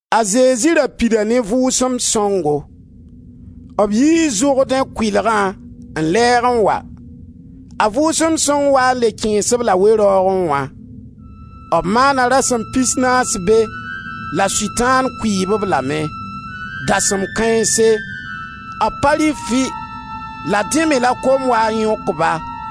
A Zezi ra pida ne Vʋʋsem Sõngo. B yii Zʋrdẽ kʋɩlgã n lɛɛg n wa. A Vʋʋsem Sõng waa n le kẽes-b la we-raoogẽ wã; b maana rasem pisnaas be la Sʋtãan kʋɩɩb-b lame. Dasem kãense, b pa rɩ fɩ; la dẽ me la kom waa n yõk-ba.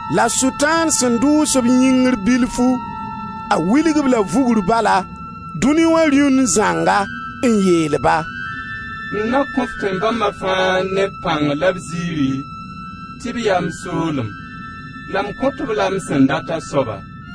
La Sʋtãan sẽn dʋʋs-b yĩngri bilfu, a wilg-b la vugr bala dũni wã rĩund zãnga, n yeel-ba: «M na kõ-f tẽn-bãmba fãa ne b pãng la b zɩɩri tɩ b yaa m soolem, la m kõt-b la m sẽn dat a soaba.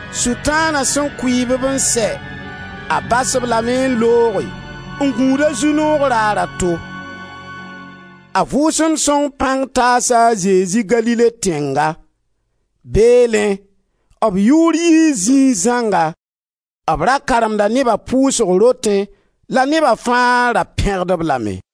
Sʋtãana sẽn kʋɩɩb-b n sɛ, a bas-b lame n looge n gũud a zu-noog raar a to. A Vʋʋsem Sõng pãng taasa a Zezi Galile tẽnga; beelẽ b yʋʋr yii zĩig zãnga. B ra karemda neba pʋʋsg rotẽ la neba fãa ra pẽgd-b lame.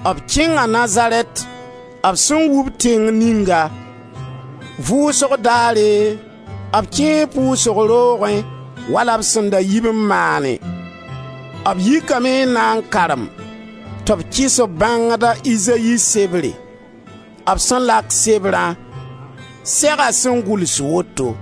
B kẽnga Nazarɛt, b sẽn wub tẽng ninga; vʋʋsg daare, b kẽe pʋʋsg roogẽ wala b sẽn da yib n maanẽ; b yikame n na n karem, tɩ b kɩs-b bãngda, a Izayi sebre. B sẽn lak sebrã, sega sẽn gʋls woto: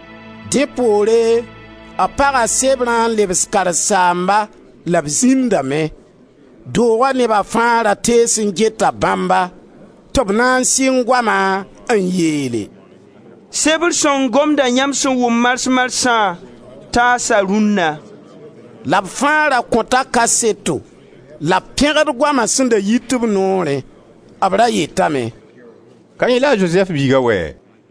Dẽ poore b paga sebrã n lebs karen-saamba la b zĩndame. Dooga neba fãa ra tees n geta bãmba. Tɩ b na n sɩng goama, n yeele: «Sebr sõng gomdã yãmb sẽn wʋm mars-marsã taasa rũnna.» La b fãa ra kõta kaseto la b pẽgd goama sẽn da yit b noorẽ. B ra yetame: «Ka yẽ la a Zozɛf biiga wɛɛ?»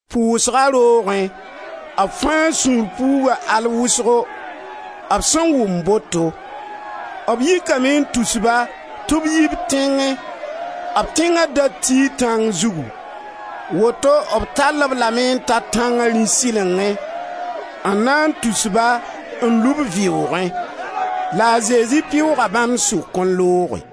Pʋʋsga roogẽ, b fãa sũur puuga al wʋsgo, b sẽn wʋm boto. B yikame n tus-ba tɩ b yi b tẽngẽ; b tẽnga da tii tãng zugu. Woto b tall-b lame n ta tãnga rĩ-sɩlengẽ n na n tus-ba n lub vɩʋʋgẽ. La a Zezi pɩʋʋga bãmb sʋk n looge.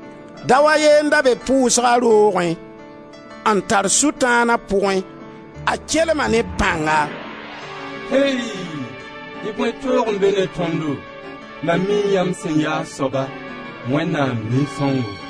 Dao a ye n da be pʋʋsga roogẽ n tar Sʋtãan a pʋgẽ, a kelma ne pãnga: «Ey! Y bõe toog n be ne tõndo. Mam mii yãmb sẽn yaa a soaba: Wẽnnaam Nin-sõngo!»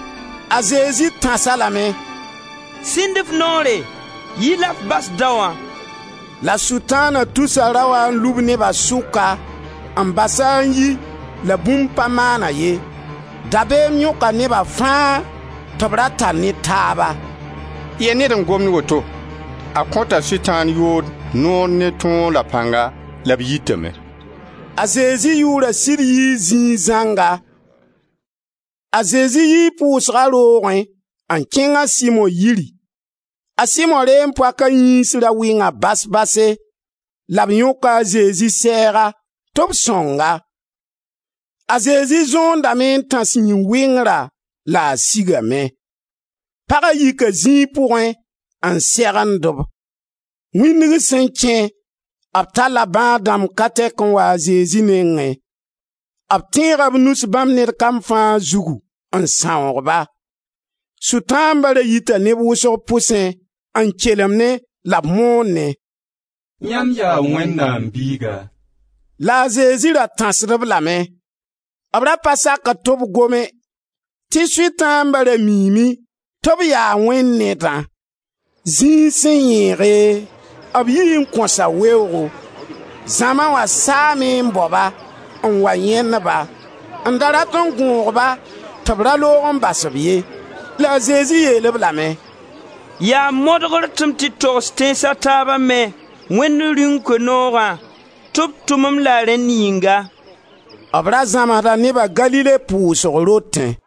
A Zezi tãs-a lame: «Sĩnd f noore, yi la f bas daoã!» La Sʋtãana tusa raoã n lub neba sʋka, n bas-a n yi la bũmb pa maan-a ye. Dabeem yõka neba fãa tɩ b ra tar ne taaba: «Yɛ ned n gomd woto? A kõta sʋtãan-yood noor ne tõog la pãnga la b yitame.» A Zezi yʋʋra sɩd yii zĩig zãnga. A Zezi yii pʋʋsga roogẽ n kẽng a Simo yiri. A Simo reem-poaka yĩns ra wɩnga bas-base la b yõka a Zezi sɛɛga tɩ b sõng-a. A Zezi zõondame n tãs yĩn-wɩngrã la a sigame. Paga yika zĩig pʋgẽ n segend-b. Wĩndg sẽn kẽ, b talla bãad-dãmb ka tɛka n wa a Zezi nengẽ. B tẽega b nus bãmb ned kam fãa zugu n sãoog-ba. Sʋtãamba ra yita neb wʋsg pʋsẽ n kelemdẽ la b moonẽ: «Yãmb yaa Wẽnnaam Biiga.» La a Zezi ra tãsd-b lame. B ra pa sakd tɩ b gome, tɩ sʋtãamba ra miime tɩ b yaa Wẽnd Nedã. Zĩig sẽn yẽege, b yii n kõsa weoogo. Zãma wã saame n bao-ba, n wa yãend-ba, n da rat n gõog-ba tɩ b ra loog n bas-b ye. La a Zezi yeel-b lame: «Yaa modgr tɩ m tɩ togs tẽns a taaba me, Wẽnd Rĩung Koe-noogã, tɩ b tʋm-m la rẽnd yĩnga.» B ra zãmsda neba Galile pʋʋsg rotẽ.